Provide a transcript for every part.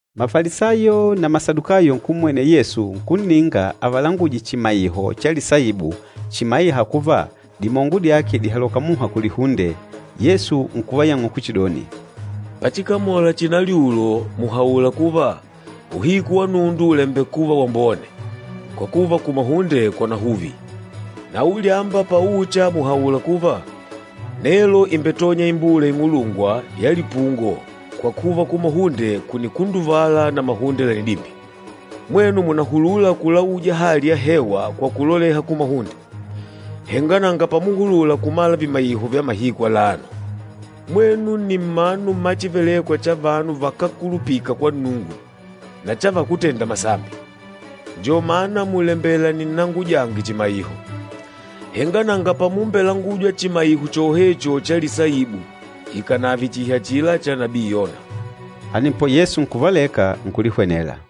Mafalisayo na Masadukayo nkummwenela Yesu nkunninga avalanguje chimaiho cha lisaibu chimaîha kuva dimongo dyake dìhaloka muha kulihunde. Yesu nkuvayang'ula kuchidoni, “Pachikamola chinalyulo, mùhaula kuva, ‘Uhiku wa nundu ùlembekuva wambone, kwa kuva kumahunde kwanahuvi.’ Na ulyamba paucha mùhaula kuva, ‘Nelo ìmbetonya imbula ing'ulungwa ya lipungo kwa kuva kumahunde kùnikunduvala na mahunde lànidimbya.’ Mwenu mùnahulula kulauja hali ya hewa kwa kuloleha kumahunde, henga nanga pamuhulula kumala vimaiho vya mahiku alano. Mwenu nni mmanu mma chívelèkwà cha vanu vakákulupika kwa Nnungu na cha vakútenda masambi, njo mana mùlembela ninnangujange chimaiho, henga nanga pamumbelangujwa chimaiho chohecho cha lisaibu ikànave chihi achila cha nabii Yona.” Anepo Yesu nkuvaleka, nkulihwenela.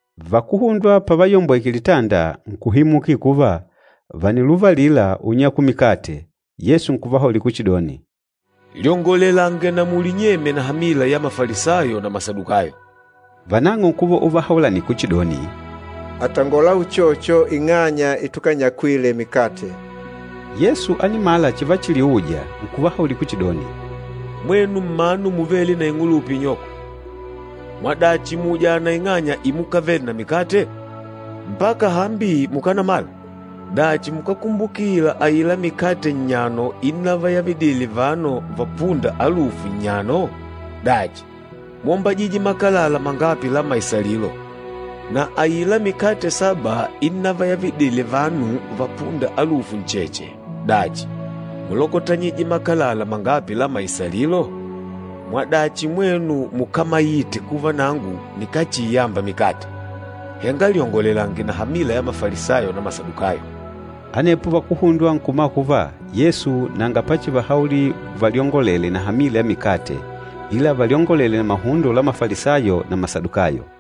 Vakuhundwa pavayombweke litanda, nkuhimukila kuva, vàniluvalila unyakula mikate. Yesu nkuvahaulila kuchidoni, “Lyongolelange na mulinyemye na hamila ya Mafalisayo na Masadukayo.” Vanang'o nkuva uvahaulanila kuchidoni, “Àtangola uchocho ing'anya itukanyakwile mikate.” Yesu ánimala chivachiliuja, nkuvahaulila kuchidoni, “Mwenu mmanu muvêle na ing'ulupa inyoko, mwadachi mùujana ing'anya imukavele na mikate? Mpaka hambi mùkanamala? Dachi, mukákumbukila aila mikate nnyano innavayavidile vanu vapûnda alufu nnyano? Dachi, mwómbajije makalala mangapi la maisalilo? Na aila mikate saba innavayavidile vanu vapûnda alufu ncheche, dachi, múlokotanyije makalala mangapi la maisalilo? Mwadachi mwenu mukámaite kuva nangu nikáchiiyamba mikate? Henga lyongolelange na hamila ya Mafalisayo na Masadukayo!” Anepo vakuhundwa nkumala kuva Yesu nanga pachivahaulila valyongolele na hamila ya mikate, ila valyongolele na mahundo la Mafalisayo na Masadukayo.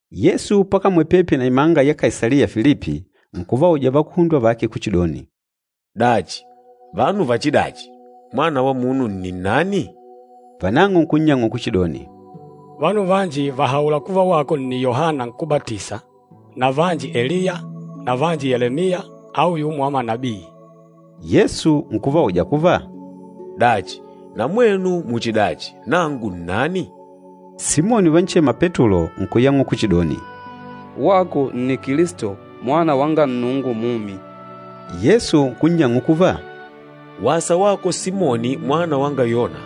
Yesu pakamwele pepi na imanga ya Kaisaliya Filipi, nkuvauja vakuhundwa vake kuchidoni, “Dachi, vanu vachidachi, Mwana wa Munu nni nnani?” Vanang'o nkunnyang'ula kuchidoni, “Vanu vanji vàhaula kuva wako nni Yohana Nkúbatisa, na vanji Eliya, na vanji Yelemiya au yumo wa manabii.” Yesu nkuvauja kuva, “Dachi, na mwenu muchidachi, nangu nnani?” Simoni uvanchema Petulo nkuyang'ula kuchidoni, “Wako nni Kilisto, Mwana wanga Nnungu mumi.” Yesu nkunnyang'ula kuva, “Wasa wako Simoni mwana wanga Yona,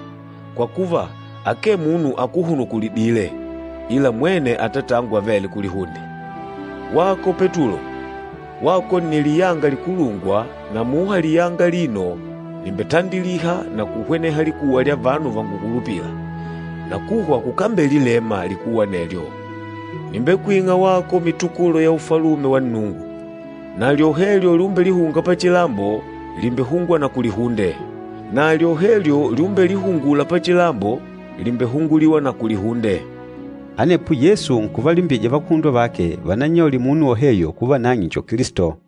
kwa kuva akee munu akuhunukulidîle, ila mwene Atatangu avêle kulihunde. Wako Petulo, wako nni liyanga likulungwa na muha liyanga alino nìmbetandiliha na kuhweneha likuwa lya vanu vangukulupîla, na kuhwa kukambelilema likuwa anelyo. Nìmbekwing'a wako mitukulo ya Ufalume wa Nnungu, na lyohelyo lyumbelihunga pachilambo, lìmbehungwa na kulihunde, na lyohelyo lyumbelihungula pachilambo, lìmbehunguliwa na kulihunde.” Anepo Yesu nkuvalimbija vakuhundwa vake vanannyaulile munu woheyo kuva nang'e njo Kilisto.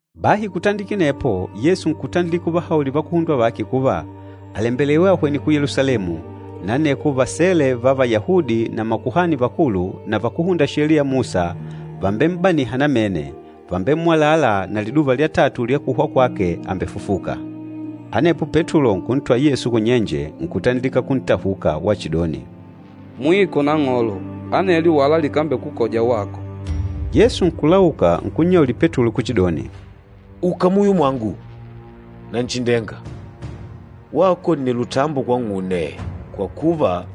Bahi kutandikila anepo, Yesu nkutandilika uvahaulila vakuhundwa vake kuva, àlembelewa ahwene ku Yelusalemu, na aneko vasele va Vayahudi na makuhani vakulu na vakúhunda Sheliya ya Musa vàmbem'baniha namene, vàmbemmwalala na liduva lya tatu lya kuhwa kwake àmbefufuka. Anepo Petulo nkuntwala Yesu kunyenje, nkutandilika kuntahuka wachidoni, “Mwiko Nang'olo, anelyo wala likambekukoja wako!” Yesu nkulauka nkunnyaulila Petulo kuchidoni, “Uka muyo mwangu, Nanchindenga! Wako nni lutambo kwang'une, kwa kuva,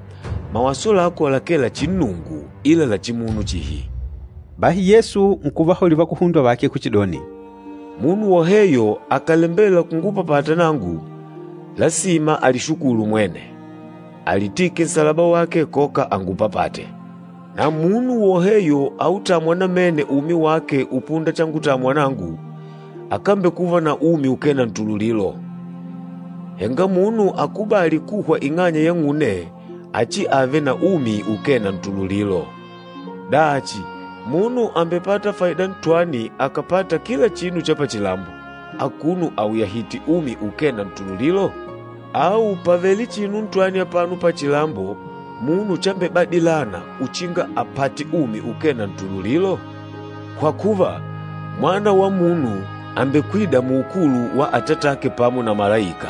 mawaso lako lakee la chinnungu ila la chimunu chihi.” Bahi Yesu nkuvahaulila vakuhundwa vake kuchidoni, “Munu woheyo akàlembela kungupapata nangu, lasima alishukulu mwene, alitike nsalaba wake koka angupapate. Na munu woheyo autâmwa namene umi wake upunda changutamwa nangu, akambekuva na umi ukee na ntululilo, henga munu akubâli kuhwa ing'anya yang'une achiave na umi ukee na ntululilo. Dachi, munu àmbepata faida ntwani akàpata kila chinu cha pachilambo, akuno auyahìtè umi ukee na ntululilo? Au pàvele chinu ntwani apano pachilambo munu chambebadilana uchinga apate umi ukee na ntululilo? Kwa kuva, Mwana wa Munu àmbekwida muukulu wa Atatake pamo na malaika,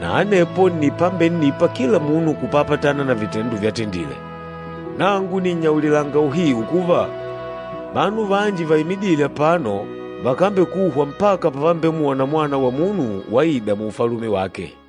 na anepo nni pambennipa kila munu kupapatana na vitendo vyatendile. Nangu nìnnyaulilanga uhiu kuva, vanu vanji vaimidîle apano vakambekuhwa mpaka pavambemwona Mwana wa Munu waida mu Ufalume wake.”